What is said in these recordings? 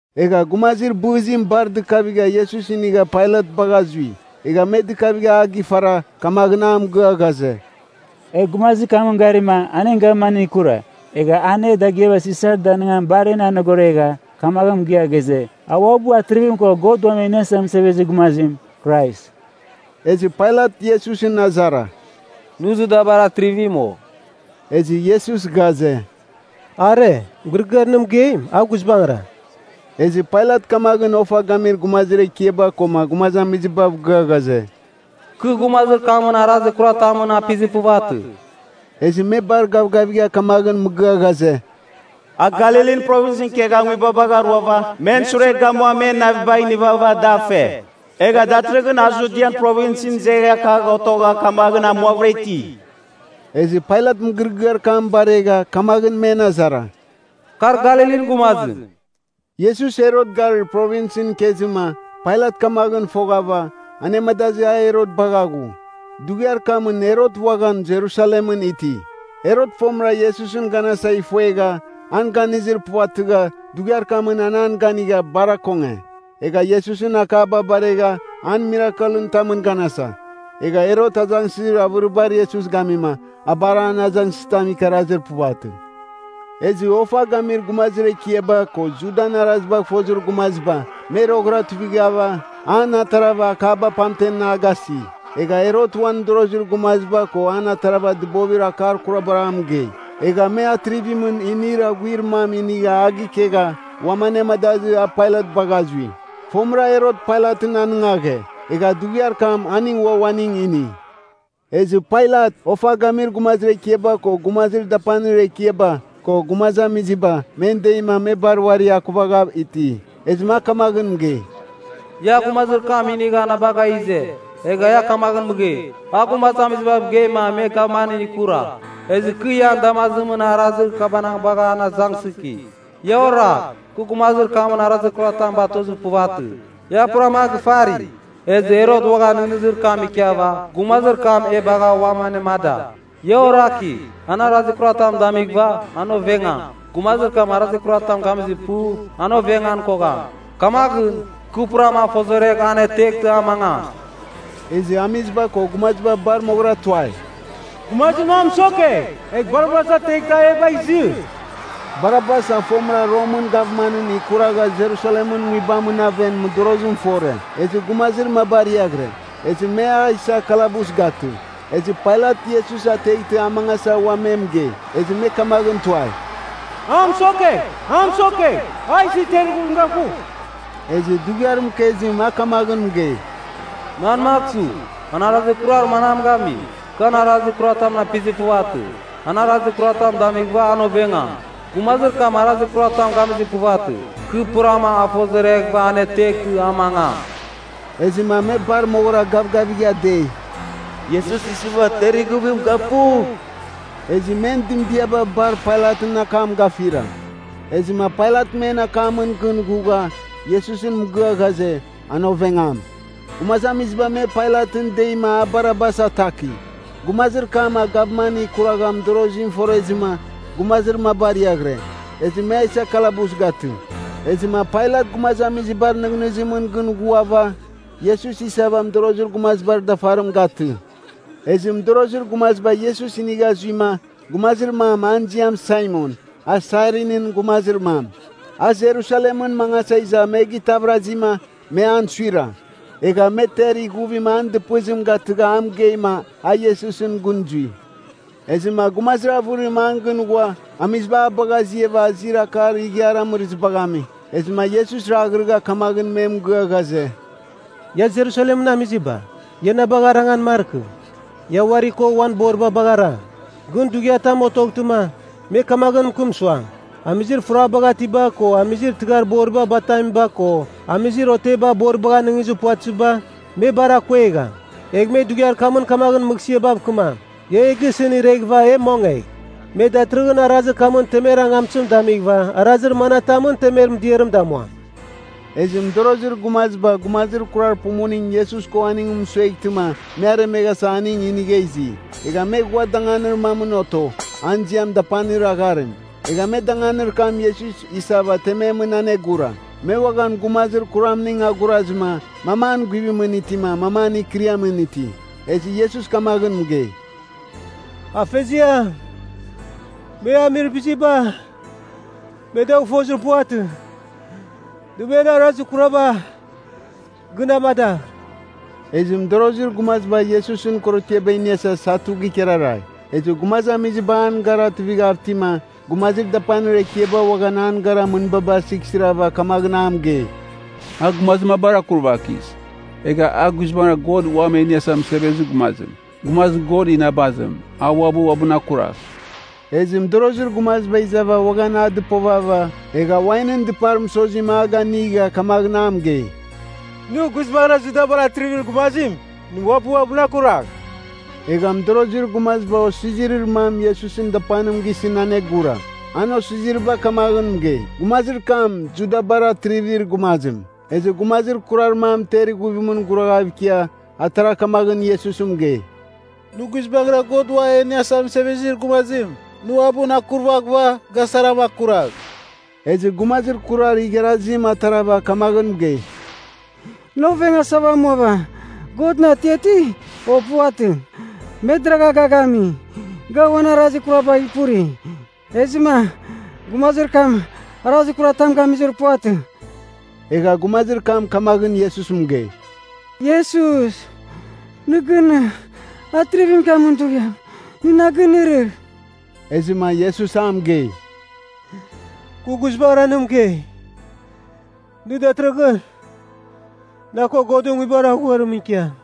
Egha gumazir bɨzim bar dɨkavigha Iesus inigha Pailat bagha zui. Egha me dɨkavigha a gifara, kamaghɨn a mɨgɨa ghaze, “E gumazir kamɨn garima an en gavmanɨn ikura. Egha an e dagɨaba Sisar danɨngan bar en anogoregha, kamaghɨn mɨgɨa ghaze, a uabɨ atrivim ko God Uam E Iniasa Mɨsevezir Gumazim, Krais.” Ezɨ Pailat Iesusɨn azara, “Nɨ Judabar atrivim, o?” Ezɨ Iesus ghaze, “Are, mɨgɨrɨgɨar nɨ mɨgeim, a guizbangɨra.” Ezɨ Pailat kamaghɨn ofa gamir gumazir ekiaba koma gumazamizibav gɨa ghaze, “Kɨ gumazir kamɨn arazir kuratamɨn apizir puvatɨ.” Ezɨ me bar gavgavigha kamaghɨn mɨgɨa ghaze, “A Galilin Provinsɨn ikegha nguibabagh aruava men sure gamua men navibagh inivava da fe. Egha datɨrɨghɨn a Judian Provinsɨn izegha kagh otogha kamaghɨn amuavɨra iti.” Ezɨ Pailat mɨgɨrɨgɨar kam baregha, kamaghɨn men azara, “Kar Galilin gumazim?” Iesus Herot garir Provinsɨn ikezɨma, Pailat kamaghɨn foghava, anemadazɨ a Herot bagha ghu. Dughiar kamɨn Herot uaghan Jerusalemɨn iti. Herot fomɨra Iesusɨn ganasa ifuegha, an ganizir puvatɨgha, dughiar kamɨn an an ganigha, bar akonge. Egha Iesusɨn akaba baregha an mirakelɨn tamɨn ganasa. Egha Herot azangsɨzir avɨravɨribar Iesus gamima, a bar an azangsɨzitam ikarazir puvatɨ. Ezɨ ofa gamir gumazir ekiaba, ko Judan arazibagh fozir gumaziba, me roghɨra tuivighava, an atarava, akaba pamtem a gasi. Egha Herot uan mɨdorozir gumaziba ko an atarava dɨbovir akar kurabar a mɨgei. Egha me atrivimɨn inir aghuir mam inigha a gikegha, uam anemadazɨ, a Pailat bagha zui. Fomɨra Herot Pailatɨn anɨngaghe, egha dughiar kam aning ua uaning ini. Ezɨ Pailat, ofa gamir gumazir ekiaba, ko gumazir dapanir ekiaba, ko gumazamiziba, men deima me bar uari akuvagha iti. Ezɨma a kamaghɨn mɨgei, “Ia gumazir kam inighava na bagha ize. Egha ia kamaghɨn mɨgei, ‘A gumazamizibav geima me gavmanɨn ikura.’ Ezɨ kɨ ian damazimɨn arazir kabanagh bagha an azangsɨki. Ia oragh! Kɨ gumazir kamɨn arazitam batozir puvatɨ. Ia purama a gifari. Ezɨ Herot uaghan nɨghnɨzir kam ikiava, gumazir kam e bagha uam anemada. Ia oraki! An arazir kuratam damighɨva, an ovengam. Gumazir kam arazir kuratam gamizir pu, an ovengan kogham. Kamaghɨn, kɨ purama a fozoregh, an ateghtɨma a mangam.” Ezɨ amiziba ko gumaziba bar moghɨra tuai, “Gumazir mamɨn mɨsokegh! Egh Barabas ateghtɨ a e bagh izɨ!” (Barabas a fomɨra Romɨn gavmanɨn ikuragha Jerusalemɨn nguibamɨn aven mɨdorozim fore. Ezɨ gumazir maba ariaghɨre. Ezɨ me a isa kalabus gatɨ.) Ezɨ Pailat Iesus ateghtɨ a mangasa ua me mɨgei. Ezɨ me kamaghɨn tuai, “A mɨsokegh! A mɨsokegh! A isɨ ter ighuvim gafugh!” Ezɨ dughiar mɨkezim a kamaghɨn mɨgei, “Manmagh su? An arazir kurar manam gami? Kɨ an arazir kuratamɨn apizir puvatɨ. An arazir kuratam damighɨva an ovengam. Gumazir kam arazir kuratam gamizir puvatɨ. Kɨ purama a fozoreghɨva aneteghtɨ, a mangam.” Ezɨma me bar moghɨra gavgavigha dei, “Iesus isɨva ter ighuvim gafugh!” Ezɨ men dɨmdiaba bar Pailatɨn akam gafira. Ezɨma Pailat men akamɨn gɨn ghugha, Iesusɨn mɨgɨa ghaze, an ovengam. Gumazamiziba me Pailatɨn deima a Barabas ataki. Gumazir kam a gavman ikuragha mɨdorozim forezɨma, gumazir maba ariaghɨre. Ezɨ me a isa kalabus gatɨ. Ezɨma Pailat gumazamizibar nɨghnɨzimɨn gɨn ghuava, Iesus isava mɨdorozir gumazibar dafarim gatɨ. Ezɨ mɨdorozir gumaziba Iesus inigha zuima, gumazir mam an ziam Saimon, a Sairinɨn gumazir mam. A Jerusalemɨn mangasa iza me gitavɨrazɨma, me an suira. Egha me ter ighuvim an dɨpɨzim gatɨgha a mɨgeima a Iesusɨn gɨn zui. Ezɨma gumazir avɨrim an gɨn ghua, amiziba a bagha aziava azir akar ighiar amɨrɨzibagh ami. Ezɨma Iesus raghrɨgha kamaghɨn me mɨgɨa ghaze, “Ia Jerusalemɨn amiziba, ia na bagh arangan markɨ. Ia uari ko uan boriba bagh arang! Gɨn dughiatam otoghtɨma, me kamaghɨn mɨkɨm suam, ‘Amizir furabaghatiba ko amizir tɨghar boriba batamiba ko, amizir oteba boribagh anɨngizir puvatɨziba, me bar akuegham.’ ‘Egh me dughiar kamɨn kamaghɨn mɨghsɨabav kɨmam, “Ia e gisɨn irɨghɨva, e mongegh!” ’ “Me datɨrɨghɨn arazir kamɨn temer angamtɨzim damighɨva arazir mana tamɨn temer mɨdiarɨm damuam?” Ezɨ mɨdorozir gumaziba gumazir kurar pumuning Iesus ko aningɨn mɨsueghtɨma me aremeghasa aning inigha izi. Egha me ghua danganir mamɨn oto, an ziam Dapanir Agharim. Egha me danganir kam Iesus isava tememɨn anegura. Me uaghan gumazir kuramning agurazɨma, mam an guvimɨn itima, mam an kɨriamɨn iti. Ezɨ Iesus kamaghɨn mɨgei, “Afeziam, me amir biziba me dagh fozir puvatɨ. Nɨ men arazir kuraba gɨn amadagh.” Ezɨ mɨdorozir gumaziba Iesusɨn korotiaba iniasa satu gikararai. Ezɨ gumazamiziba an gara tuivighav itima, gumazir dapanir ekiaba uaghan an gara mɨnbaba sighsirava kamaghɨn a mɨgei. “A gumazir mabar akurvakis. Egh a guizbangɨra God Uam E Iniasa Mɨsevezir Gumazim, gumazir God inabazim, a uabɨ uabɨn akuragh.” Ezɨ mɨdorozir gumaziba izava uaghan a dɨpovava, egha wainɨn dɨpar mɨsozim a ganigha kamaghɨn a mɨgei, “Nɨ guizbangɨra Judabar atrivir gumazim, nɨ uabɨ uabɨn akuragh!” Egha mɨdorozir gumaziba osizirir mam Iesusɨn dapanim gisɨn anegura. An osiziriba kamaghɨn mɨgei, “Gumazir kam Judabar Atrivir Gumazim.” Ezɨ gumazir kurar mam ter ighuvimɨn guraghav ikia, atara kamaghɨn Iesusɨn mɨgei, “Nɨ guizbangɨra God Uam E Iniasa Mɨsevezir Gumazim, nɨ uabɨn akurvaghɨva ga sarama akuragh!” Ezɨ gumazir kurar igharazim atarava kamaghɨn mɨgei, “Nɨ ovengasava amuava, Godɨn atiati, o puvatɨ? Me deragha ga gami, ga uan arazir kurabagh ipuri. Ezɨma gumazir kam arazir kuratam gamizir puvatɨ.” Egha gumazir kam kamaghɨn Iesus mɨgei, “Iesus, nɨ gɨn atrivimɨn ikiamin dughiam nɨ na ginɨrɨgh.” Ezɨma Iesus a mɨgei, “Kɨ guizbangɨra nɨ mɨgei, nɨ datɨrɨghɨn na ko Godɨn Nguibar Aghuarimɨn ikiam.”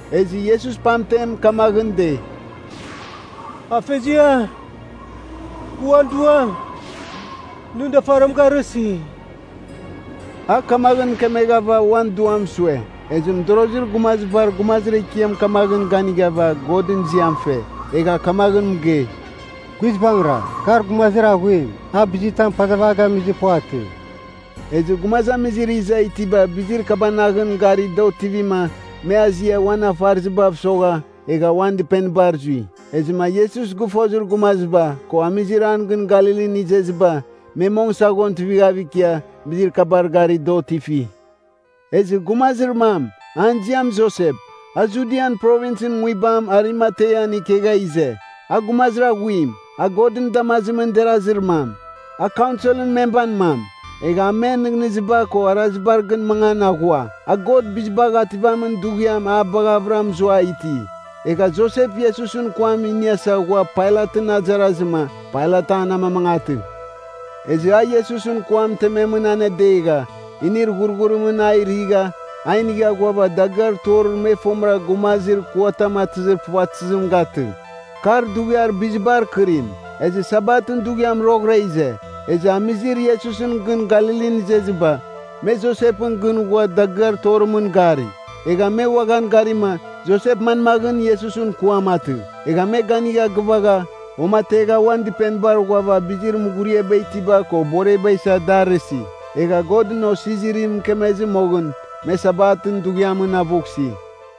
Ezɨ Iesus pamtem kamaghɨn dei, “Afeziam, kɨ uan duam nɨn dafarim garɨsi.” A kamaghɨn mɨkemeghava uan duam sue. Ezɨ mɨdorozir gumazibar gumazir ekiam kamaghɨn ganighava Godɨn ziam fe. Egha kamaghɨn mɨgei, “Guizbangɨra, kar gumazir aghuim, a bizitam pazava a gamizir puvatɨ.” Ezɨ gumazamizir iza itiba bizir kabanaghɨn gari da otivima, me azia, uan afarɨzibav mɨsogha, egha uan dɨpenibar zui. Ezɨma Iesus gɨfozir gumaziba, ko amizir an gɨn Galilin izeziba, me mong saghon tuivigha ikia, bizir kabar gari da otifi. Ezɨ gumazir mam, an ziam Josep, a Judian Provinsɨn nguibam Arimatean ikegha ize. A gumazir aghuim, a Godɨn damazimɨn derazir mam, a Kaunsel memban mam. Egha a men nɨghnɨziba ko arazibar gɨn mangan aghua. A God Bizibagh Ativamin Dughiam a baghavɨra muza iti. Egha Josep Iesusɨn kuam iniasa ghua Pailatɨn azarazɨma, Pailat an amamangatɨ. Ezɨ a Iesusɨn kuam tememɨn anedegha, inir ghurghurimɨn a righa, a inigha ghuava dagɨar torir me fomɨra gumazir kuatam atɨzir puvatɨzim gatɨ. Kar dughiar bizibar kɨrim, ezɨ Sabatɨn dughiam roghɨra ize. Ezɨ amizir Iesusɨn gɨn Galilin izeziba, me Josepɨn gɨn ghua dagɨar torimɨn gari. Egha me uaghan garima, Josep manmaghɨn Iesusɨn kuam atɨ. Egha me ganigha gɨvaghava, uamategha uan dɨpenibar ghuava bizir mughuriaba itiba ko boreba isa da arɨsi. Egha Godɨn osizirim mɨkemezɨ moghɨn, me Sabatɨn dughiamɨn avughsi.